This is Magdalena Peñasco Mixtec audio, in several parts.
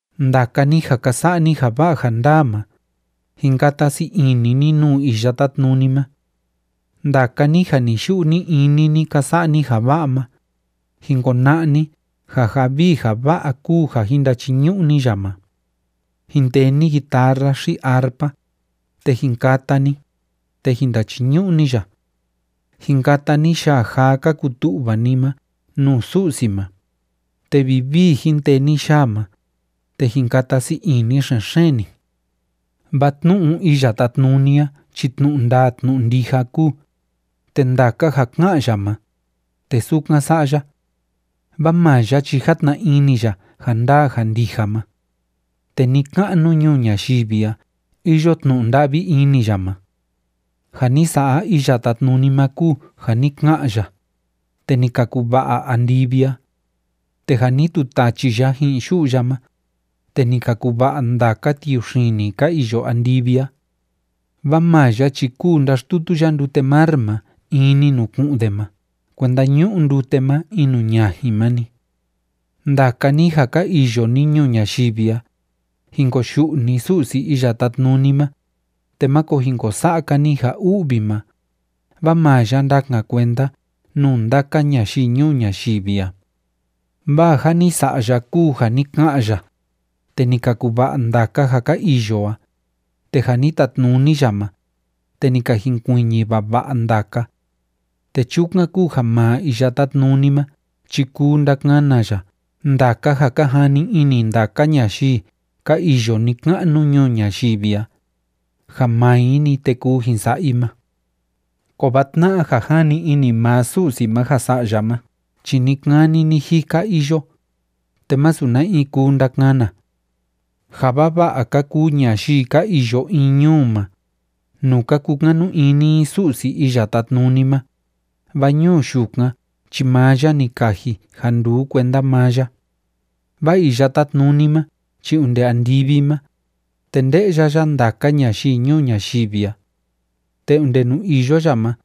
Ndaka ni ja ka sa'a ni ja va'a ja ndaa ma, jin kata sii ini ni nuu Iya Tátnuni ma. Ndaka ni ja ni‑yu'u ni‑ini ni ka sa'a ni ja va'a ma, jin kona'a ni ja ja vii ja va'a kúu ja jin ndachiñu'u ni ya ma. Jin tee ni guitarra xi arpa, te jin kata ni, te jin ndachiñu'u ni ya. Jin kata ni yaa jaa ka kutu'va ni ma nuu Su'si ma, te vivii jin tee ni yaa ma, te jin kata sii ini xen‑xeen ni. Vaa tnu'u Iya Tátnuni a chi tnu'u ndaa tnu'u ndija kúu, te ndaka ja ká'an ya ma, te sukan sa'a ya. Vaa maa ya chi játna ini ya ja ndaa ja ndija ma. Te ni‑ka'nu ñuu ñayivi a iyo tnu'u nda'vi ini ya ma. Ja ni sa'a Iya Tátnuni ma kúu ja ni ka'an ya, te ni ka kuva'a andivi a. Te ja ni tutachi ya ji'in yu'u ya ma, te ni ka kuva'a ndaka tiuxini ka iyo andivi a. Vaa maa ya chi kúu ndáxtutu ya ndute mar ma in‑ni nuu ku'un de ma kuenda ñu'u ndute ma in nuu ñajin ma‑ni. Ndaka ni, ja ka iyo ni ñuu ñayivi a, jin koyu'u ni Su'si Iya Tátnuni ma, te máko jin ko sa'a‑ka ni ja u'vi ma, vaa maa ya ndakan kuenda nuu ndaka ñayii ñuu ñayivi a. Vaa ja ni sa'a ya kúu ja ni ka'an ya, te ni ka kuva'a ndaka ja ka iyo a, te ja ni tatnuni ya ma, te ni ka jinkuiñi vava'a ndaka. Te chukan kúu ja maa Iya Tátnuni ma chi kuu ndakana ya ndaka ja ka jani ini ndaka ñayii ka iyo ni‑ka'nu ñuu ñayivi a, ja maa i‑ni, te kuu jin sa'a i ma. Kovaa tna'a ja jani ini maa Su'si ma ja sa'a ya ma chi ni‑kani ni‑jika iyo, te masu na in kuu ndakana. Ja vava'a ka kuu ñayii ka iyo in ñuu ma, nuu ka kukanu ini i Su'si Iya Tátnuni ma, vaa ñuu yukan chi maa ya ni kaji ja nduu kuenda maa ya. Vaa Iya Tátnuni ma chi onde andivi ma, te nde'ya ya ndaka ñayii ñuu ñayivi a. Te onde nuu iyo ya ma,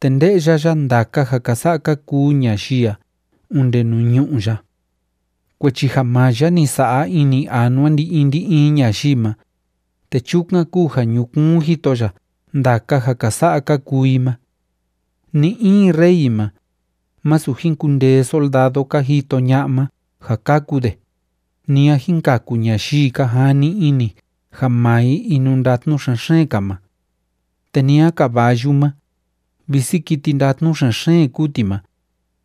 te nde'ya ya ndaka ja ka sa'a ka kuu ñayii a onde nuu ñu'ú ya. Kuechi ja maa ya ni sa'a ini anua ndi‑in ndi‑in ñayii ma, te chukan kúu ja ñukuun jito ya ndaka ja ka sa'a ka kuu i ma. Ni‑in rey ma, másu jin kundee soldado ka jito ña'a ma ja kaku de, ni a jin kaku ñayii ka jani ini ja maa i inundatnu xen‑xeen‑ka ma. Te ni a caballu ma, visi kiti ndatnu xen‑xeen kúu ti ma,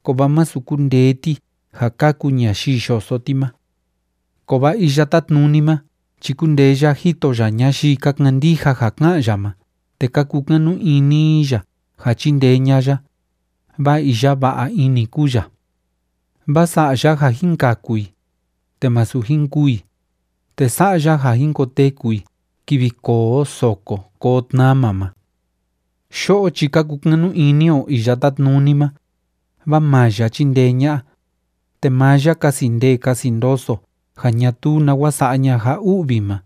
kovaa masu kundee ti ja kaku ñayii yoso ti ma. Kovaa Iya Tátnuni ma chi kúndee ya jito ya ñayii ka kandija ja ká'an ya ma te ka kukanu ini i ya ja chindee ña'a ya, vaa iya va'a ini kúu ya. Vaa sa'a ya ja jin kaku i, te masu jin kûu i, te sa'a ya ja jin koteku i kivi koo soko koo tnama ma. Yo'o chi ka kukanu ini o Iya Tátnuni ma, vaa maa ya chindee ña'a, te maa ya kasi ndee kasi ndoso ja ñatuu nawa sa'a ña'a ja u'vi ma.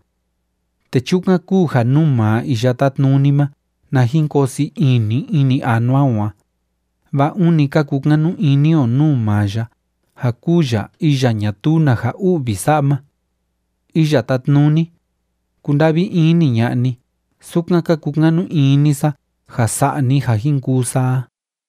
Te chukan kúu ja nuu maa Iya Tátnuni ma na jin koo sii ini ini anua o a, vaa ûni ka kukanu ini o nuu maa ya ja kúu ya iya ñatuu na ja u'vi sa'a ma. Iya Tátnuni, kunda'vi ini ña'a ni, sukan ka kukanu ini sa ja sa'a ni ja jin kuu sa a.